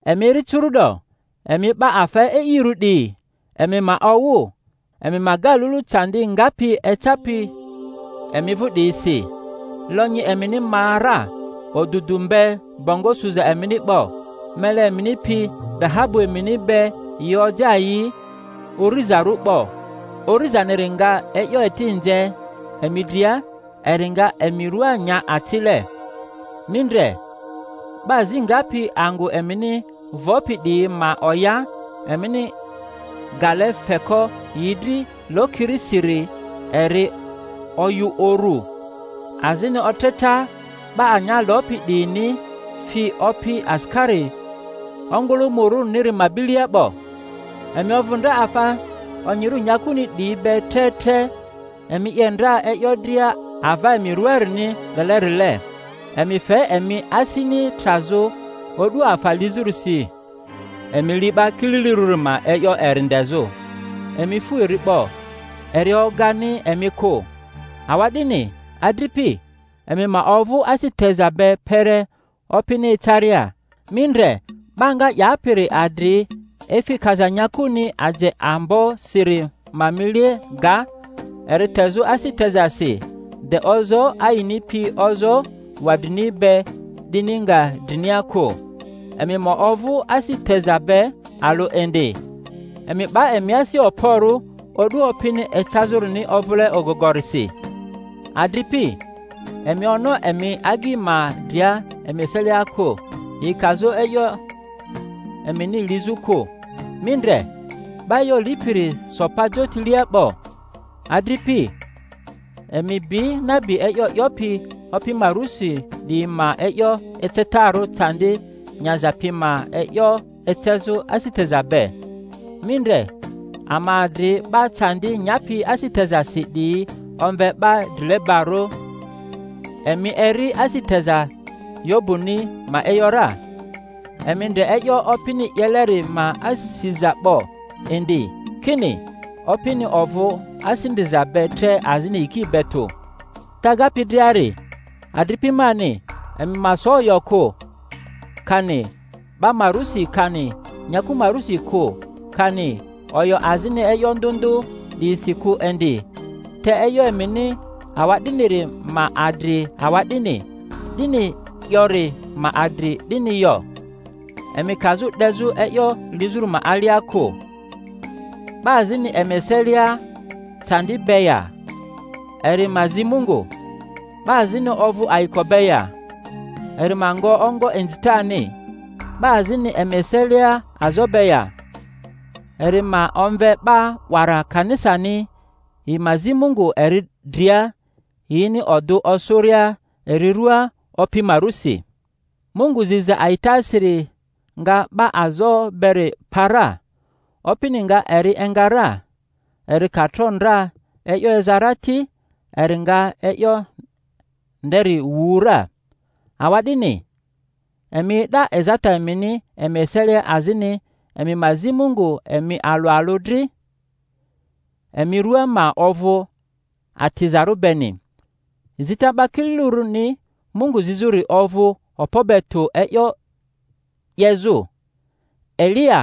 Emi eri curu’do, emi 'ba afa e'irᴜ 'diyi, emi ma owᴜ, emi ma ga lulu candi ngapi ecapi emi vᴜ 'diyisi. Lonyi emini ma ra, odudu mbe bongo suza emini 'bo. Mele emini pi dahabu emini be yi oja yi urizarᴜ 'bo; urizaniri nga e'yo eti nze emi dria, eri nga emi rᴜa nya acile. Mi ndre, 'ba azi ngapi angᴜ emini vopi 'diyi ma oya, emini gale feko yi dri lokirisiri eri oyᴜ uru; azini otreta 'ba anya lopi 'diyini fi Opi asikari ongᴜlᴜmᴜrᴜniri ma bilia 'bo. Emi ovᴜ ndra afa onyirᴜ nyakuni 'diyi be tre tre, emi 'ye ndra e'yo dria ava emi ruaarini lelerile; emi fe emi asini trazᴜ o'du afa lizᴜrisi. Emi li 'ba kililirᴜri ma e'yo eri ndezᴜ, emi fu eri 'bo; eri ogani emi kᴜ. Awa'dini, adripi, emi ma ovᴜ asi teza be kpere Opini ecaria. Mi ndre, 'ba nga 'yapiri adri efi kaza nyakuni aje ambosiri ma mile ga, eri tezᴜ asi tezasi de ozoo ayini pi ozoo wadrini be 'dini nga drinia kᴜ. Emi ma ovᴜ asi teza be alᴜ indi. Emi 'ba emi asi okporᴜ, o'du Opini ecazᴜrini ovᴜle ogogorisi. Adripi, emi ono emi agyi ma dria emi eselia kᴜ, yi kazᴜ e'yo emini lizᴜ kᴜ; mi ndre, 'Ba e'yo Lipiri so pa jotilea 'bo. Adripi, emi bi nabi e'yo 'yopi Opi ma rusi 'diyi ma e'yo ecetarᴜ candi nyaza pi ma e'yo ecezᴜ asi teza be. Mi ndre, ama adri 'ba candi nyapi asi tezasi 'diyi omve 'ba drilebarᴜ. Emi eri asi teza Yobuni ma e’yo ra, emi ndre e'yo Opini 'yeleri ma asiza 'bo indi, kini Opini ovᴜ asi ndriza be tre azini yiki be tᴜ. Te agapi driari, adripi mani, emi ma so oyo kᴜ, kani 'ba ma rusi kani nyaku ma rusi kᴜ, kani oyo azini e'yo ndᴜ ndᴜ 'diyisi kᴜ indi, te e'yo emini awa'diniri ma adri awa'dini, 'dini yori ma adri 'dini yo; emi kazᴜ 'dezᴜ e'yo lizᴜri ma alia kᴜ. 'Ba azini emi eselia eandi be ya? Eri ma zi Mungu. 'Ba azini ovᴜ ayiko be ya? Eri ma ngo ongo inzitani. 'Ba azini emi eselia azo be ya? Eri ma omve 'ba 'wara kanisani, yi ma zi Mungu eri dria, yini odᴜ osᴜria eri ruaa Opi ma rᴜsi; Mungu ziza a'itasiri nga 'ba azo beri pa ra, Opini nga eri enga ra; eri ka tro ndra e'yo eza ra ti, eri nga e'yo nderi wu ra. Awa'dini, emi e'da ezata emini emi eselia, azini emi ma zi Mungu emi alᴜ alᴜ dri, emi rua ma ovᴜ atizarᴜ beni. Zita 'ba kililirᴜni Mungu zizᴜri ovᴜ okpo be tᴜ e'yo 'yezᴜ. Eliya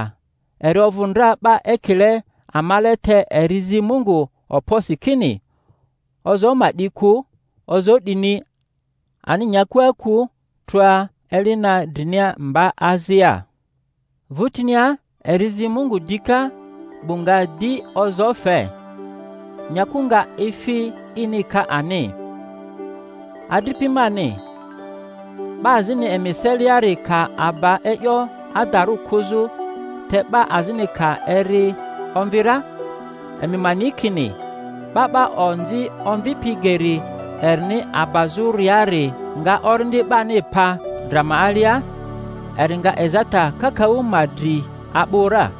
eri ovᴜ ndra 'ba ekile amale, te eri zi Mungu okposi kini ozoo ma 'di kᴜ; ozoo 'dini ani nyakua kᴜ trᴜa eli na drinia mba azia. Vᴜtinia eri zi Mungu dika; 'bu nga di ozoo fe, nyaku nga efi ini ka ani. Adripi mani, 'ba azini emi eseliari ka aba e'yo adarᴜ kᴜzᴜ, te 'ba azini ka eri omvi ra, emi ma ni kini 'ba 'ba onzi omvipi geri erini abazᴜriari nga orindi 'bani pa dra ma alia, eri nga ezata kakaᴜ ma dri a'bᴜ ra.